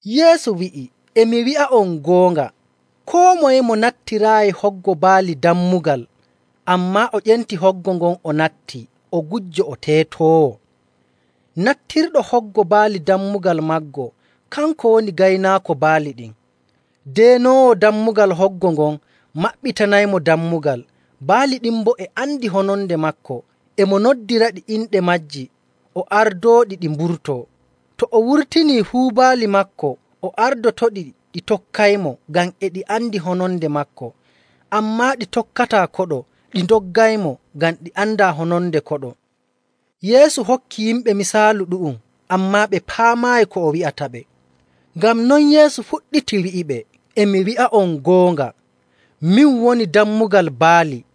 Yeesu wi'i, “E mi wi'a'on goonga, koo moye mo nattiraayi hoggo baali dammugal, ammaa o ƴenti hoggo ngon o natti, o gujjo o teetoowo. Nattirɗo hoggo baali dammugal maago, kanko woni gaynaako baali ɗin. Deenoowo dammugal hoggo ngon maɓɓitanaymo dammugal, baali ɗin boo e andi hononde maako. E mo noddiraɗi inɗe maaji, o ardooɗi ɗi mburtoo. To o wurtinii fuu baali maako, o ardotoɗi, ɗi tokkaymo, ngam e ɗi andi hononde maako. Ammaa ɗi tokkataa koɗo, ɗi ndoggaymo, ngam ɗi andaa hononde koɗo.” Yeesu hokki yimɓe misaalu ɗu'um, ammaa ɓe paamaayi ko o wi'ataɓe. Ngam non Yeesu fuɗɗiti wi'iɓe, “E mi wi'a'on goonga, min woni dammugal baali.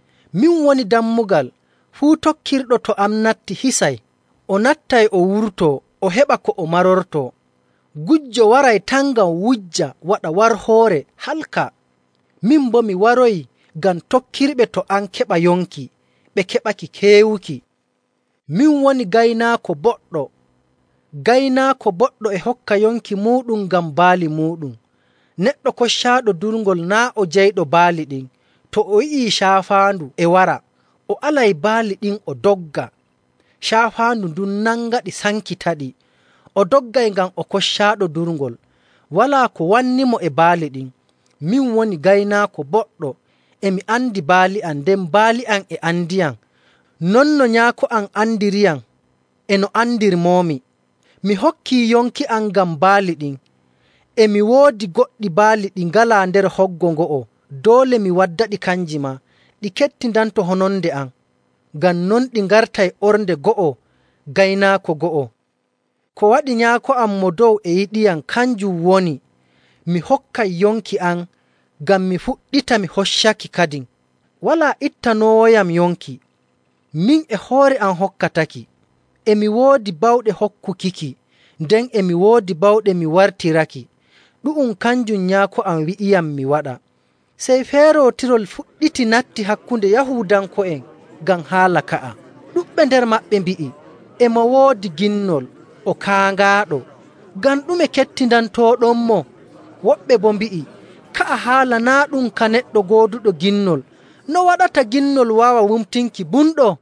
Min woni dammugal. Fuu tokkirɗo to am natti hisay, o nattay, o wurtoo, o heɓa ko o marortoo. Gujjo waray tan ngam wujja, waɗa warhoore, halka. Min boo mi waroyi ngam tokkirɓe to am keɓa yonki, ɓe keɓaki keewuki. “Min woni gaynaako boɗɗo. Gaynaako boɗɗo e hokka yonki muuɗum ngam baali muuɗum. Neɗɗo koccaaɗo durngol naa' o jeyɗo baali ɗin. To o yi'ii caafaandu e wara, o alay baali ɗin o dogga. Caafaandu ndun nangaɗi sankitaɗi. O doggay ngam o koccaaɗo durngol, walaa ko wannimo e baali ɗin. Min woni gaynaako boɗɗo. E mi andi baali am, nden baali am e andiyam, non no Nyaako am andiriyam, e no andirmoomi. Mi hokkii yonki am ngam baali ɗin.. E mi woodi goɗɗi baali ɗi ngalaa nder hoggo ngo'o. Doole mi waddaɗi kanji maa. Ɗi kettindanto hononde am. Ngam non ɗi ngartay ornde go'o, gaynaako go'o. “Ko waɗi Nyaako am Mo Dow e yiɗiyam, kanjum woni mi hokkay yonki am, ngam mi fuɗɗita mi hoccaki kadin. Walaa ittanoowoyam yonki. Min e hoore am hokkataki. E mi woodi bawɗe hokkukiki, nden e mi woodi bawɗe mi wartiraki. Ɗu'um kanjum Nyaako am wi'iyam mi waɗa.” Sey feerootirol fuɗɗiti natti hakkunde Yahuudanko'en ngam haala ka'a. Ɗuɗɓe nder maɓɓe mbi'i, “E mo woodi ginnol, o kaaŋaaɗo. Ngam ɗume kettindantooɗonmo?” Woɓɓe boo mbi'i, “Ka'a haala naa' ɗum ka neɗɗo gooduɗo ginnol. No waɗata ginnol waawa wumtinki bumɗo?”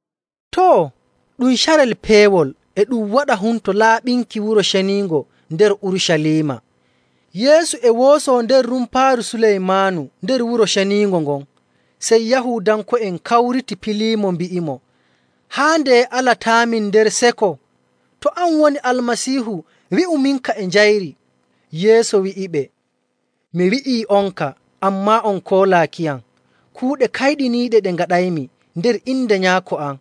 Too, ɗum carel peewol, e ɗum waɗa Humto Laaɓinki Wuro Ceniingo nder Urucaliima. Yeesu e woosoo nder Rumpaaru Suleymaanu nder Wuro Ceniingo ngon. Sey Yahuudanko'en kawriti piliimo mbi'imo, “Haa ndeye alataamin nder seko? To an woni Almasiihu wi'uminka e njayri.” Yeesu wi'iɓe, “Mi wi'ii'onka, ammaa on koolaakiyam. Kuuɗe kayɗiniiɗe ɗe ngaɗaymi nder inde Nyaako am,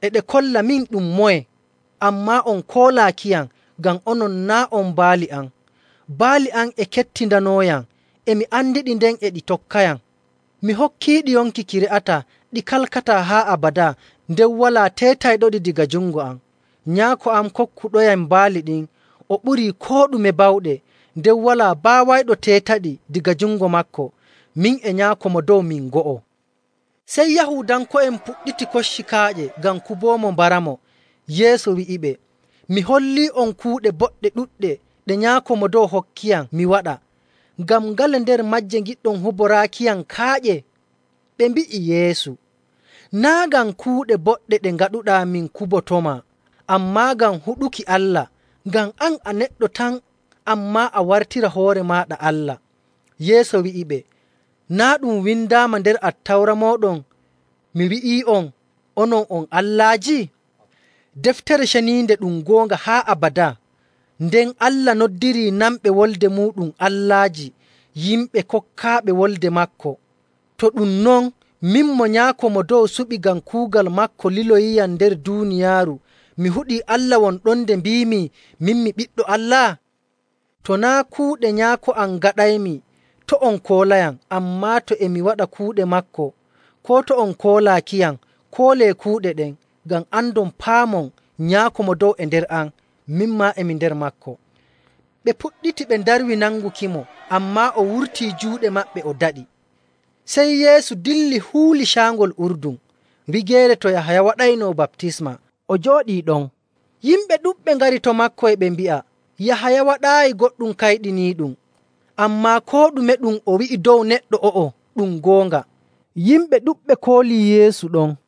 e ɗe kolla min ɗum moye, ammaa on koolaakiyam, ngam onon naa' on baali am. Baali am e kettindanooyam. E mi andiɗi, nden e ɗi tokkayam. Mi hokkiiɗi yonki ki re'ataa, ɗi kalkataa haa abadaa, nden walaa teetayɗoɗi daga jungo am. Nyaako am kokkuɗoyam baali ɗin, o ɓurii koo ɗume bawɗe, nden walaa baawayɗo teetaɗi daga jungo maako. Min e Nyaako Mo Dow min go'o.” Sey Yahuudanko'en puɗɗiti kocci kaaƴe ngam kuboomo mbaramo. Yeesu wi'iɓe, “Mi hollii'on kuuɗe boɗɗe ɗuɗɗe ɗe Nyaako Mo Dow hokkiyam mi waɗa. Ngam ngale nder maaje ngiɗɗon huboraakiyam kaaƴe?” Ɓe mbi'i Yeesu, “Naa' ngam kuuɗe boɗɗe ɗe ngaɗuɗaa min kubotomaa, ammaa ngam huɗuki Allah. Ngam an a neɗɗo tan, ammaa a wartira hoore maaɗa Allah.”. Yeesu wi'iɓe, “Naa' ɗum windaama nder Attawra mooɗon, ‘Mi wi'ii'on, onon on allaaji?’. Deftere Ceniinde ɗum goonga haa abadaa, nden Allah noddirii nanɓe wolde muuɗum allaaji, yimɓe kokkaaɓe wolde maako. To ɗum non, min mo Nyaako Mo Dow suɓi ngam kuugal maako liloyiyam nder duuniyaaru, mi huɗii Allah won ɗon nde mbiimi, ‘Min mi Ɓiɗɗo Allah?’ To naa' kuuɗe Nyaako am ngaɗaymi, to' on koolayam. Ammaa to e mi waɗa kuuɗe maako, koo to on koolaakiyam, koolee kuuɗe ɗen, ngam andon paamon Nyaako Mo Dow e nder am, min maa e mi nder maako.” Ɓe puɗɗiti ɓe ndarwi nangukimo, ammaa o wurtii juuɗe maɓɓe o daɗi. Sey Yeesu dilli huuli Caangol Urdun, wigeere to Yahaya waɗayno baptisma, o jooɗii ɗon.. Yimɓe ɗuɗɓe ngari to maako, e ɓe mbi'a, “Yahaya waɗaayi goɗɗum kayɗiniiɗum, ammaa koo ɗume ɗum o wi'i dow neɗɗo o'o ɗum goonga.” Yimɓe ɗuɗɓe koolii Yeesu ɗon.